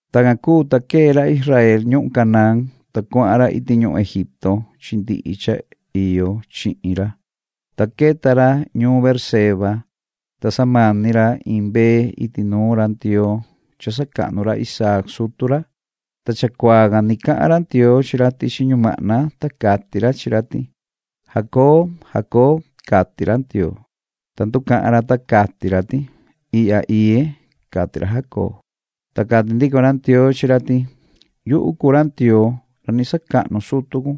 Tacan cuu, ta quee ra Israel ñuhun Canaán, ta cuahan ra iti ñuhun Egipto chi ndihi cha iyo chihin ra, ta queta ra ñuun Beerseba, ta samani ra iin mbee iti nuun ra Ndioo cha sacahnu ra Isaac sutu ra. Ta chacuaa can ni cahan ra Ndioo chi ra tichi ñumahna, ta cati ra chi ra ti: ―¡Jacob, Jacob! ―cati ra Ndioo. Ta nducahan ra, ta cati ra ti: ―Ihya iye ―cati ra Jacob. Ta cati ndico ra Ndioo chi ra ti: ―Yuhu cuu ra Ndioo ra ni sacahnu sutu cun.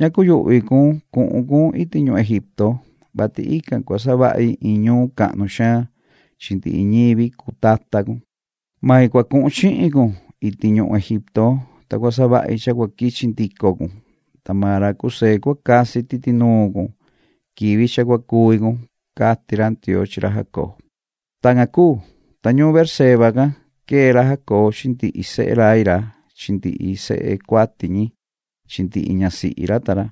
Ña cuyuhvi cun cuhun cun iti ñuhun Egipto, vati ican cua savahi iin ñuun cahnu xaan chi ndihi ñivi cuu tata cun. Main cua cuhun chihin cun iti ñuhun Egipto, ta cua savahi cha cua quichi ndico cun. Ta maan ra José cua casi titi nuun cun quivi cha cua cuvi cun ―cati ra Ndioo chi ra Jacob. Tacan cuu, ta ñuun Beerseba can quee ra Jacob chi ndihi sehe rai ra chi ndihi sehe cuati ñi chi ndihi ñasihi ra ta ra,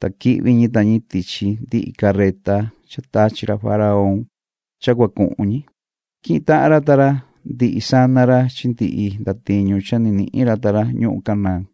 ta quihvi ñi ta ñi tichi ndihi carreta cha tachi ra faraón cha cua cuhun ñi. Quihin tahan ra ta ra ndihi sana ra chi ndihi ndatiñu cha ni nihin ra ta ra ñuhun Canaán,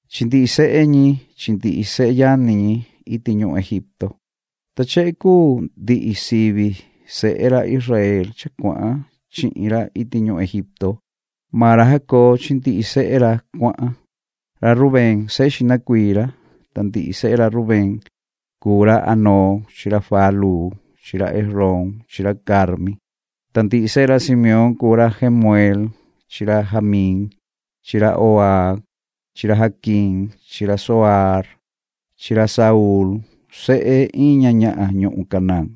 chi ndihi sehe ñi chi ndihi seyani ñi iti ñuhun Egipto. Ta chehe cuu ndihi sivi sehe ra Israel cha cuahan chihin ra iti ñuhun Egipto. Maan ra Jacob chi ndihi sehe ra cuahan. Ra Rubén sehe xihna cuii ra. Ta ndihi sehe ra Rubén cuu ra Hanooc chi ra Falu chi ra Hezrón chi ra Carmi. Ta ndihi sehe ra Simeón cuu ra Jemueel chi ra Jamín chi ra Ohaad chi ra Jaquín chi ra Zohaar chi ra Saúl sehe iin ña ñahan ñuhun Canaán.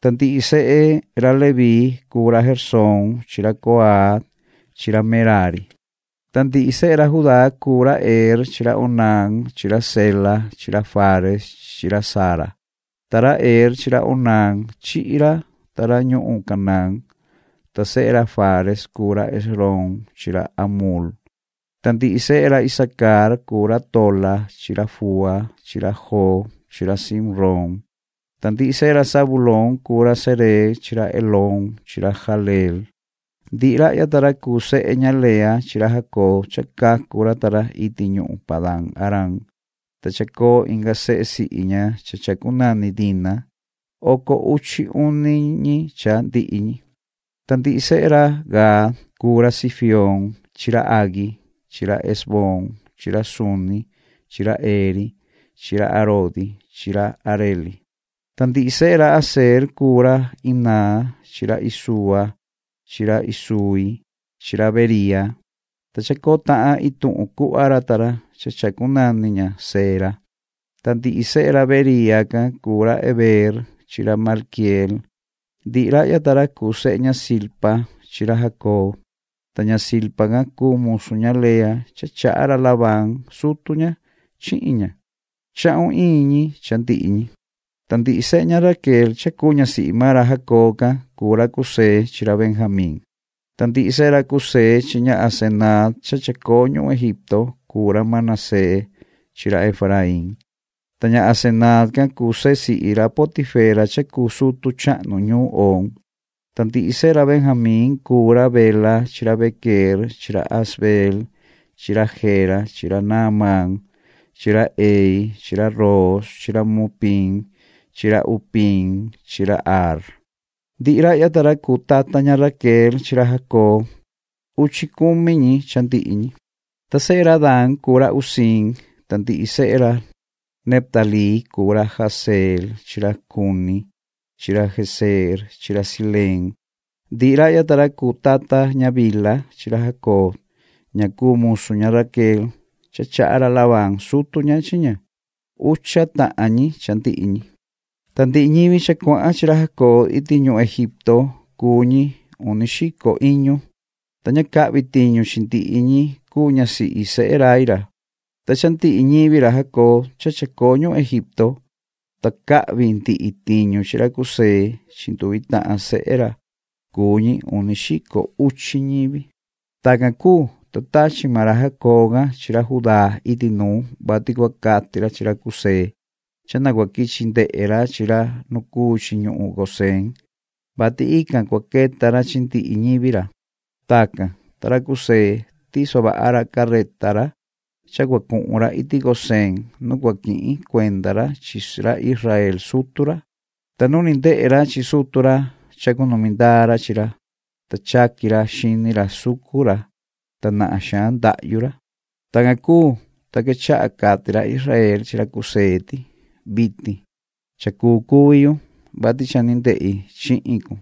Ta ndihi sehe ra Leví cuu ra Gersón chi ra Coat chi ra Merari. Ta ndihi sehe ra Judá cuu ra Er chi ra Onán chi ra Sela chi ra Fares chi ra Zara, ta ra Er chi ra Onán chihi ra ta ra ñuhun Canaán. Ta sehe ra Fares cuu ra Hezrón chi ra Hamul. Ta ndihi sehe ra Isacar cuu ra Tola chi ra Fua chi ra Job chi ra Simrón. Ta ndihi sehe ra Zabulón cuu ra Sered chi ra Elón chi ra Jahleel. Ndihi rahya ta ra cuu sehe ña Lea chi ra Jacob cha cacu ra ta ra iti ñuhun Padan-aram, ta chacoo inga sehe sihi ña cha chacunani Dina. Oco uchi uni ñi cha ndihi ñi. Ta ndihi sehe ra Gad cuu ra Zifioon chi ra Hagui chi ra Ezboon chi ra Suni chi ra Eri chi ra Arodi chi ra Areli. Ta ndihi sehe ra Aser cuu ra Imnaa chi ra Isuua chi ra Isuui chi ra Beriia, ta chacoo tahan ituhun cuhva ra ta ra cha chacunani ña Sera. Ta ndihi sehe ra Beriia can cuu ra Heber chi ra Malquieel. Ndihi rahya ta ra cuu sehe ña Zilpa chi ra Jacob. Ta ña Zilpa can cuu musu ña Lea cha chaha ra Labán sutu ña chihin ña. Chahun iin ñi cha ndihi ñi. Ta ndihi sehe ña Raquel cha cuu ñasihi maan ra Jacob can cuu ra José chi ra Benjamín. Ta ndihi sehe ra José chi ña Asenaat cha chacoo ñuhun Egipto cuu ra Manasés chi ra Efraín. Ta ña Asenaat can cuu sehe sihi ra Potifera cha cuu sutu chahnu ñuun Oon. Ta ndihi sehe ra Benjamín cuu ra Bela chi ra Bequeer chi ra Asbeel chi ra Gera chi ra Naamaan chi ra Ehi chi ra Roos chi ra Mupiim chi ra Hupiim chi ra Ard. Ndihi rahya ta ra cuu tata ña Raquel chi ra Jacob. Uchi cumi ñi cha ndihi ñi. Ta sehe ra Dan cuu ra Husiim. Ta ndihi sehe ra Neftalí cuu ra Jahzeel chi ra Guni chi ra Jezeer chi ra Sileem. Ndihi rahya ta ra cuu tata ña Bilha chi ra Jacob ña cuu musu ña Raquel cha chaha ra Labán sutu ña chi ña. Ucha tahan ñi cha ndihi ñi. Ta ndihi ñivi cha cuahan chi ra Jacob iti ñuhun Egipto cuu ñi uni xico iñu, ta ña cahvi tiñu chi ndihi ñi cuu ñasihi sehe rai ra. Ta cha ndihi ñivi ra Jacob cha chacoo ñuhun Egipto, ta cahvi ndihi tiñu chi ra José chi nduvi tahan sehe ra, cuu ñi uni xico uchi ñivi. Tacan cuu, ta tachi maan ra Jacob can chi ra Judá iti nuu, vati cua cati ra chi ra José cha na cua quichi ndehe ra chi ra nu cuu chi ñuhun Gosén, vati ican cua queta ra chi ndihi ñivi ra. Tacan, ta ra José, tiso vaha ra carreta ra cha cua cuhun ra iti Gosén nu cua quihin cuenda ra chi ra Israel sutu ra. Ta nu ni ndehe ra chi sutu ra, chacunumi ndaa ra chi ra, ta chaqui ra xini ra sucu ra, ta nahan xaan ndahyu ra. Tacan cuu, ta quechaha cati ra Israel chi ra José ti: ―Vitin cha cuu cuvi yu, vati cha ni ndehi chihin cun,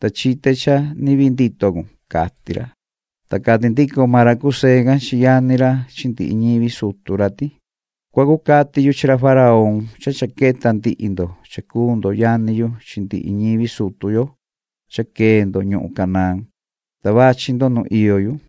ta chite cha ni vii ndito cun ―cati ra. Ta cati ndico maan ra José can chi yani ra chi ndihi ñivi sutu ra ti: ―Cua cucati yu chi ra faraón cha cha queta ndihi ndo cha cuu ndo yani yu chi ndihi ñivi sutu yo cha quee ndo ñuhun Canaán, ta vachi ndo nu iyo yu.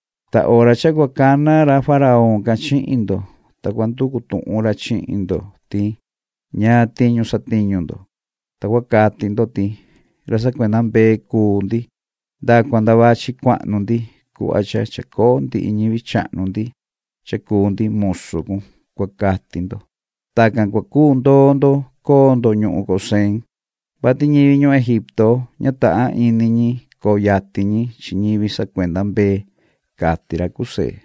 Ta hora cua cana ra faraón can chihin ndo, ta cua nducu tuhun ra chihin ndo ti: “¿Ñaan tiñu satiñu ndo?”, ta cua cati ndo ti:” Ra sacuenda mbee cuu ndi nda cua nda vachi cuahnu ndi cuhva cha chacoo ndihi ñivi chahnu ndi cha cuu ndi musu cun”, cua cati ndo. Tacan cua cuu ndoo ndo coo ndo ñuhun Gosén, vati ñivi ñuhun Egipto, ña tahan ini ñi coo yatin ñi chi ñivi sacuenda mbee chi chivu ―cati ra José.